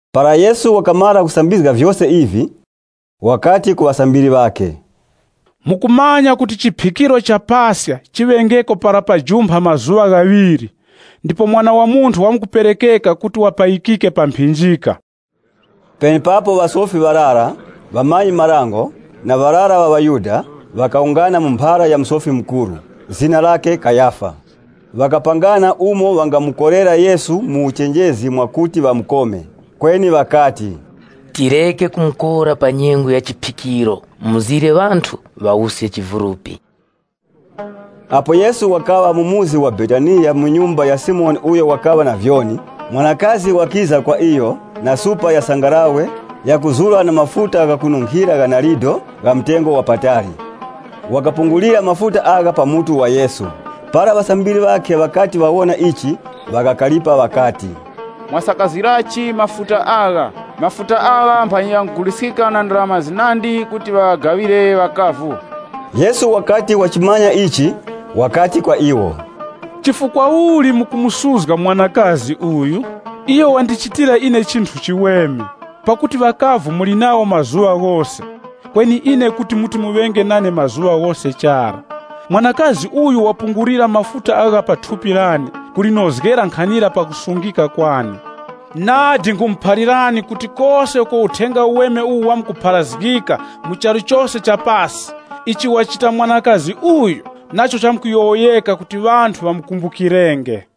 Para Yesu wakamara kusambizga vyose ivi, wakati ku ŵasambiri ŵakhe, “Mukumanya kuti chiphikiro cha Paska chiŵengeko para pajumpha mazuŵa ghaŵiri, ndipo Mwana wa Munthu wamkuperekeka kuti wapayikike pa mphinjika.” Penepapo ŵasofi ŵarara, ŵamanyi-marango na ŵarara ŵa ŵaYuda, ŵakawungana mu mphara ya Musofi Mukuru, zina lakhe Kayafa. Ŵakapangana umo ŵangamukorera Yesu mu uchenjezi mwakuti ŵamukome. Kweni ŵakati, “Tireke kumukora pa nyengo ya chiphikiro, mzire ŵanthu ŵawuske chivulupi.” Apo Yesu wakaŵa mu muzi wa Betaniya mu nyumba ya Simoni uyo wakaŵa na vyoni, mwanakazi wakiza kwa iyo na supa ya sangalawe yakuzura na mafuta gha kununkhira gha narido gha mtengo wa patali. Wakapungulira mafuta agha pa mutu wa Yesu. Para ŵasambiri ŵakhe ŵakati ŵawona ichi ŵakakaripa ŵakati, “Mwasakazirachi mafuta agha? Mafuta agha mphanyi ghanguguliskika na ndarama zinandi kuti ŵaŵagaŵire ŵakavu.” Yesu wakati wachimanya ichi, wakati kwa iwo, “Chifukwa uli mukumusuzga mwanakazi uyu? Iyo wandichitira ine chinthu chiweme. Pakuti ŵakavu muli nawo mazuŵa ghose, kweni ine kuti muti muŵenge nane mazuŵa ghose chara. Mwanakazi uyu wapungulira mafuta agha pa thupi lane kulinozgera nkhanira pakusungika kwane. Nadi nkhumuphalirani kuti kose uko Uthenga Uweme uwu wamkupharazgika mu charu cha pasi, icho wachita mwanakazi uyu nacho chamkuyowoyeka kuti ŵamukumbukenge.”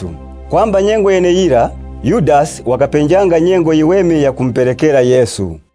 Kwamba nyengo yeneyira, Yudasi wakapenjanga nyengo yiweme yakumuperekera Yesu.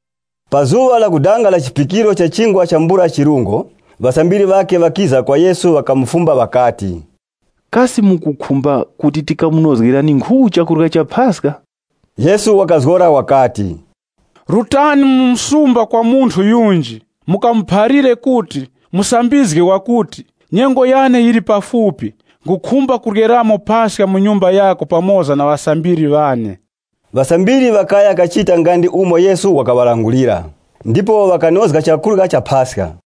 Pa zuŵa lakudanga la chiphikiro cha Chingwa chambula chirungo, ŵasambiri ŵakhe ŵakiza kwa Yesu ŵakamufumba ŵakati, “Kasi mukukhumba kuti tikamunozgerani nkhu chakurya cha Paska?” Yesu wakazgora wakati, “Rutani mu msumba kwa munthu yunji, mukamuphalire kuti, ‘Musambizgi wakuti, nyengo yane yili pafupi, nkhukhumba kuryeramo Paska mu nyumba yako pamoza na ŵasambiri ŵane.’” Ŵasambiri ŵakaya kachita nga ndi umo Yesu wakaŵalangulira, ndipo ŵakanozga chakurya cha Paska.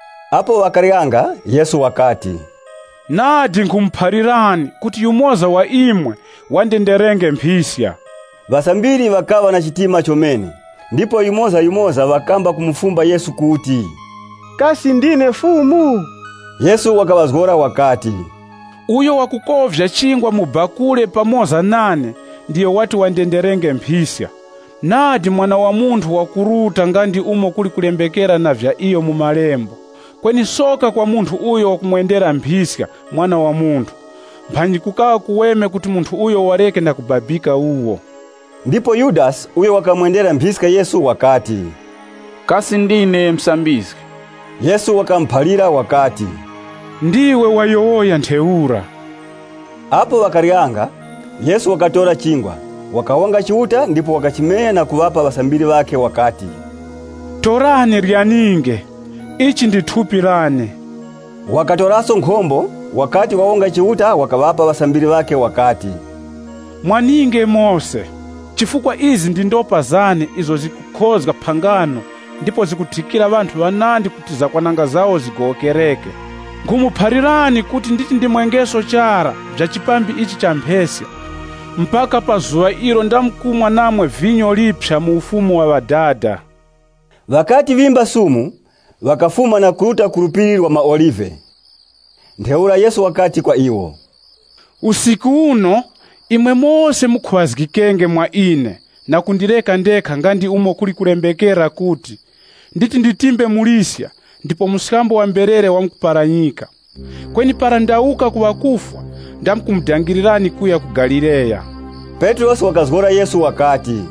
Apo ŵakaryanga, Yesu wakati, “Nadi nkhumuphalirani kuti yumoza wa imwe wandenderenge mphiska.” Ŵasambiri ŵakaŵa na chitima chomene, ndipo yumozayumoza ŵakamba kumufumba Yesu kuti, “Kasi ndine Fumu?” Yesu wakaŵazgora wakati, “Uyo wakukovya chingwa mu bakule pamoza nane, ndiyo wati wandenderenge mphiska. Nadi Mwana wa Munthu wakuruta nga ndi umo kuli kulembekera na vya iyo mu malembo, kweni soka kwa munthu uyo wakumwendera mphiska Mwana wa Munthu! Mphanyi kukaŵa kuweme kuti munthu uyo wareke na kubabika wuwo.” Ndipo Yudasi uyo wakamwendera mphiska Yesu wakati, “Kasi ndine, Musambizgi?” Yesu wakamuphalira wakati, “Ndiwe wayowoya ntheura.” Apo ŵakaryanga, Yesu wakatora chingwa, wakawonga Chiuta ndipo wakachimenya na kuŵapa ŵasambiri ŵakhe wakati, “Torani ryaninge, ili ndi thupi lane.” Wakatoraso nkhombo, wakati wawonga Chiuta wakaŵapa ŵasambiri wakati, “Mwaninge mose. Chifukwa izi ndi ndopa zane izo zikukhozga phangano ndipo zikuthikira ŵanthu ŵanandi kuti zakwananga zawo zigowokereke. Nkhumuphalirani kuti nditi ndimwengeso chara vya chipambi ichi cha mpheska mpaka pa zuŵa ilo ndamkumwa namwe kuphya mu Ufumu wa Ŵadada.” Ŵakati ŵimba sumu, ŵakafuma na kuruta ku Phiri la maOlive. Ntheura Yesu wakati kwa iwo, “Usiku uno, imwe mose mukhuŵazgikenge mwa ine na kundireka ndekha nga ndi umo kuli kulembekera kuti, ‘Nditi nditimbe muliska ndipo mberere zamkumbininika.’ Kweni para ndawuka ku ŵakufwa, ndamkumudangirirani kuya ku Galileya.” Petrosi wakazgora Yesu wakati,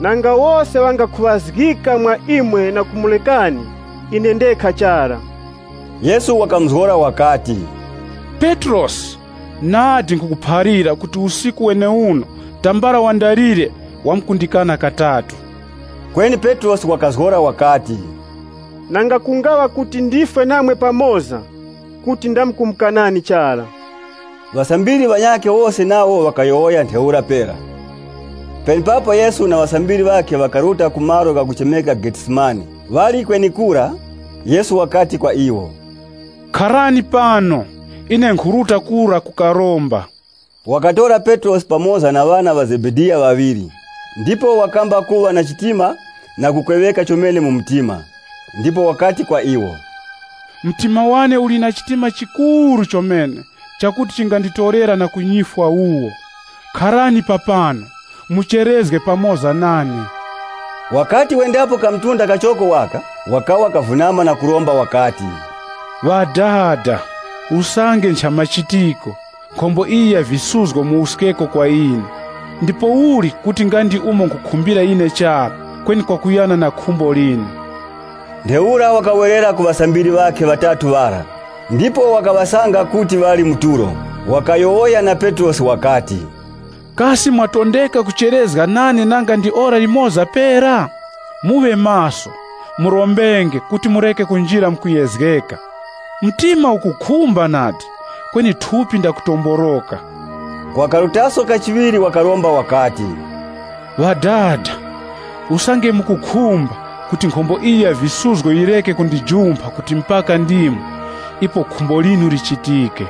“Nanga wose ŵangakhuŵazgika mwa Imwe na kumurekani, ine ndekha chara.” Yesu wakamuzgora wakati, “Petrosi, nadi nkhukuphalira kuti usiku weneuwo, tambala wandalire, wamkundikana katatu.” Kweni Petrosi wakazgora wakati, “Nanga kungaŵa kuti ndifwe namwe pamoza, kuti ndamkumukanani chara.” Ŵasambiri ŵanyakhe wose nawo ŵakayowoya ntheura pera. Penepapo Yesu na ŵasambiri ŵakhe ŵakaruta ku malo ghakuchemeka Getsemane. Ŵali kwenekura, Yesu wakati kwa iwo, “Kharani pano, ine nkhuruta kura kukaromba.” Wakatora Petrosi pamoza na ŵana ŵa Zebediya ŵaŵiri, ndipo wakamba kuŵa na chitima na kukweŵeka chomene mu mtima. Ndipo wakati kwa iwo, “Mtima wane uli na chitima chikuru chomene chakuti chinganditorera na ku nyifwa wuwo. Kharani papano, mucherezge pamoza nane.” Wakati wendapo ka mtunda kachoko waka, wakawa kavunama na kuromba wakati, “Ŵadada, usange nchamachitiko, nkhombo iyi ya visuzgo muwuskeko kwa ine. Ndipouli kuti nga ndi umo nkhukhumbira ine chara, kweni kwakuyana na khumbo linu.” Ntheura wakawerera ku ŵasambiri ŵakhe ŵatatu ŵara, ndipo wakaŵasanga kuti ŵali mu tulo. Wakayowoya na Petrosi wakati, “Kasi mwatondeka kucherezga nane nanga ndi ora limoza pera? Muŵe maso, murombenge kuti mureke kunjira mu kuyezgeka. Mtima ukukhumba nadi, kweni thupi ndakutomboroka.” Wakarutaso kachiŵiri wakaromba wakati, “Ŵadada, usange mukukhumba kuti nkhombo iyi ya visuzgo yireke kundijumpha kuti mpaka ndimwe, ipo khumbo linu lichitike.”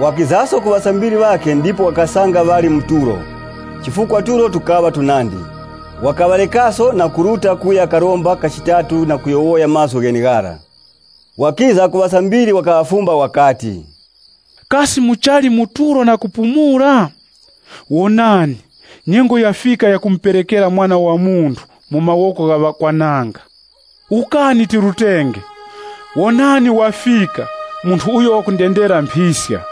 Wakizaso ku ŵasambiri ŵakhe ndipo wakaŵasanga ŵali mu tulo, chifukwa tulo tukaŵa tunandi. Wakaŵarekaso na kuruta kuya karomba kachitatu na kuyowoya mazgu gheneghara. Wakiza ku ŵasambiri wakaŵafumba wakati, “Kasi muchali mu tulo na kupumula? Wonani, nyengo yafika yakumuperekera Mwana wa Munthu mu mawoko gha ŵakwananga. Wukani tirutenge. Wonani wafika munthu uyo wakundendera mphiska.”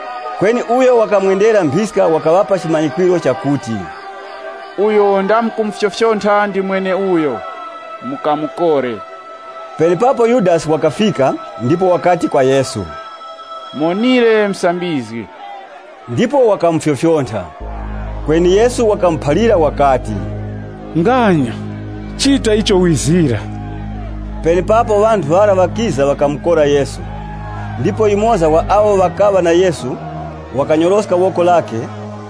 Kweni uyo wakamwendera mphiska wakaŵapa chimanyikwiro chakuti, “Uyo ndamkumufyofyontha ndi mweneuyo. Mukamukore.” Penepapo Yudasi wakafika, ndipo wakati Yesu, “Muwonire Musambizgi.” Ndipo wakamufyofyontha. Kweni Yesu wakamuphalira wakati, “Nganya, chita icho wizira.” Penepapo ŵanthu ŵara ŵakiza ŵakamukora Yesu. Ndipo yumoza wa awo ŵakaŵa na Yesu, wakanyoroska woko lakhe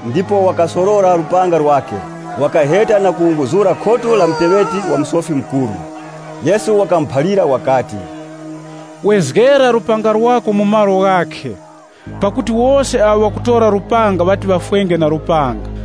ndipo wakasorora lupanga lwakhe, wakaheta na kuwunguzura khutu la muteŵeti wa Musofi Mukuru. Yesu wakamuphalira wakati, “Wezgera lupanga lwako mu malo ghakhe, pakuti wose awo ŵakutora lupanga ŵati ŵafwenge na lupanga.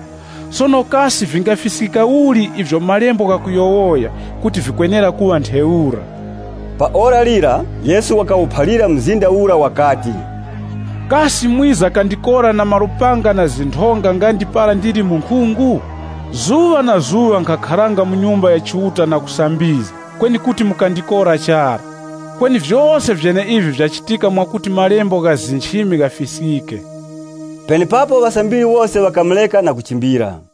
Sono kasi vingafiskika uli ivyo malembo ghakuyowoya kuti vikwenera kuŵa ntheura?” Pa ora lira Yesu wakawuphalira mzinda ura wakati, “Kasi mwiza kandikora na malupanga na zinthonga nga ndi para ndili munkhungu? Zuŵa na zuŵa nkhakharanga mu Nyumba ya Chiuta na kusambizga, kweni kuti mukandikora chara. Kweni vyose vyeneivi vyachitika mwakuti malembo gha nchimi ghafiskike.” Penepapo ŵasambiri wose ŵakamureka na kuchimbira.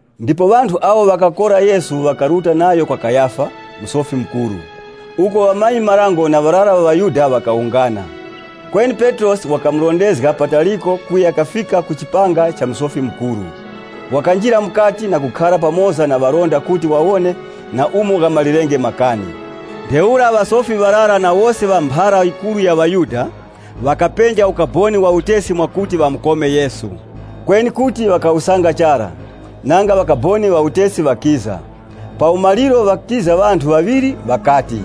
Ndipo ŵanthu awo ŵakakora Yesu ŵakaruta nayo kwa Kayafa, Musofi Mukuru, uko ŵamanyi-marango na ŵarara ŵa ŵaYuda ŵakawungana. Kweni Petrosi wakamurondezga pataliko kuya kafika ku chipanga cha Musofi Mukuru. Wakanjira mukati na kukhara pamoza na ŵalinda kuti wawone na umo ghamalirenge makani. Ntheura ŵasofi ŵarara na wose ŵa mphara yikuru ya ŵaYuda ŵakapenja ukaboni wa utesi mwakuti ŵamukome Yesu. Kweni kuti ŵakawusanga chara, nanga ŵakaboni ŵa utesi ŵakiza. Pa umaliro ŵakiza ŵanthu ŵaŵiri, ŵakati,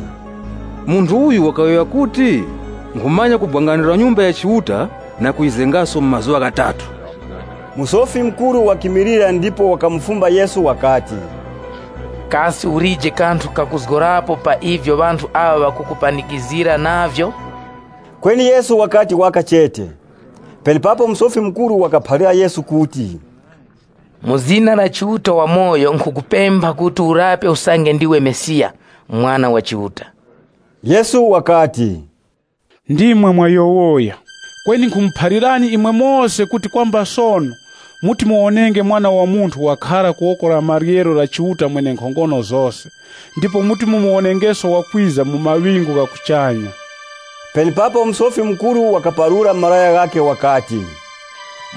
“Munthu uyu wakayowoya kuti, ‘Nkhumanya kubwangandula Nyumba ya Chiuta na kuyizengaso mu mazuŵa ghatatu.’” Musofi Mukuru wakimilira ndipo wakamufumba Yesu wakati, “Kasi ulije kanthu kakuzgorapo pa ivyo ŵanthu aŵa ŵakukupanikizgira navyo?” Kweni Yesu wakati waka chete. Penepapo Musofi Mukuru wakaphalira Yesu kuti, “Mu zina la Chiuta wamoyo nkhukupempha kuti urape usange ndiwe Mesiya, Mwana wa Chiuta.” Yesu wakati kwa iyo, “Ndimwe mwayowoya. Kweni nkhumuphalirani imwe mose kuti kwamba sono muti muwonenge Mwana wa Munthu wakhara ku woko la maryero la Chiuta Mwenenkhongono zose ndipo muti mumuwonengeso wakwiza mu maŵingu gha kuchanya.” Penepapo Musofi Mukuru wakaparura malaya ghakhe wakati,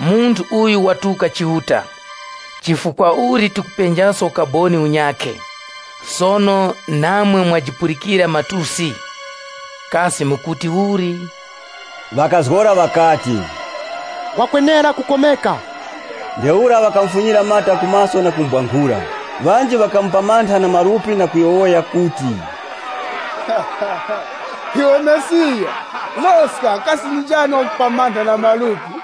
“Munthu uyu watuka Chiuta. Chifukwa uli tikupenjaso ukaboni unyakhe? Sono namwe mwajipulikira matusi. Kasi mukuti uli?” Ŵakazgora ŵakati, “Wakwenera kukomeka.” Ntheura ŵakamufunyira mata ku maso na kumubwankhura. Ŵanji ŵakamupamantha na malupi na kuyowoya kuti, “Iwe Mesiya, loska, kasi ndi njani wakupamantha na malupi?”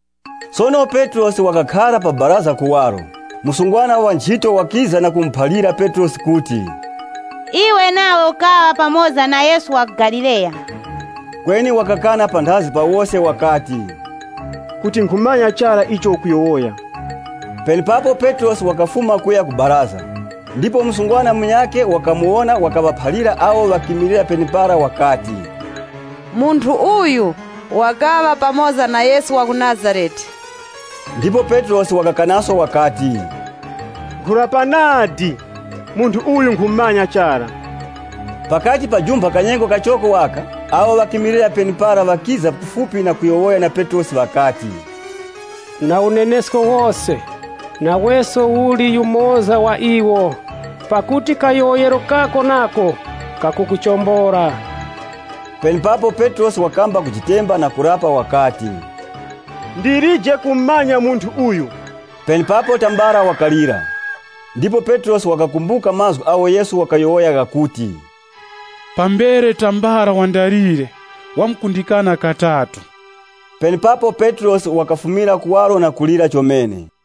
Sono Petrosi wakakhara pa baraza kuwaro, msungwana wanchito, wakiza na kumuphalira Petrosi kuti, “Iwe nawe ukaŵa pamoza na Yesu wa ku Galileya.” Kweni wakakana panthazi pa wose wakati, “Kuti nkhumanya chara icho ukuyowoya.” Penepapo Petrosi wakafuma kuya ku chipata cha baraza, ndipo msungwana munyakhe wakamuwona wakaŵaphalira awo ŵakimilira penepara wakati, “Munthu uyu wakaŵa pamoza na Yesu wa ku Nazarete.” Ndipo Petrosi wakakanaso wakati, “Nkhurapa nadi, munthu uyu nkhumumanya chara.” Pakati pajumpha kanyengo kachoko waka, awo ŵakimilira penepara ŵakiza kufupi na kuyowoya na Petrosi, ŵakati, “Na unenesko wose, naweso uli yumoza wa iwo, pakuti kayowoyero kako nako kakukuchombola.” Penepapo Petrosi wakamba kutemba na kurapa wakati, “Ndilije kumumanya munthu uyu.” Penepapo tambala wakalira. Ndipo Petrosi wakakumbuka mazgu agho Yesu wakayowoya, ghakuti, “Pambere, tambala wandalire, wamkundikana katatu.” Penepapo Petrosi wakafumira kuwaro na kulira chomene.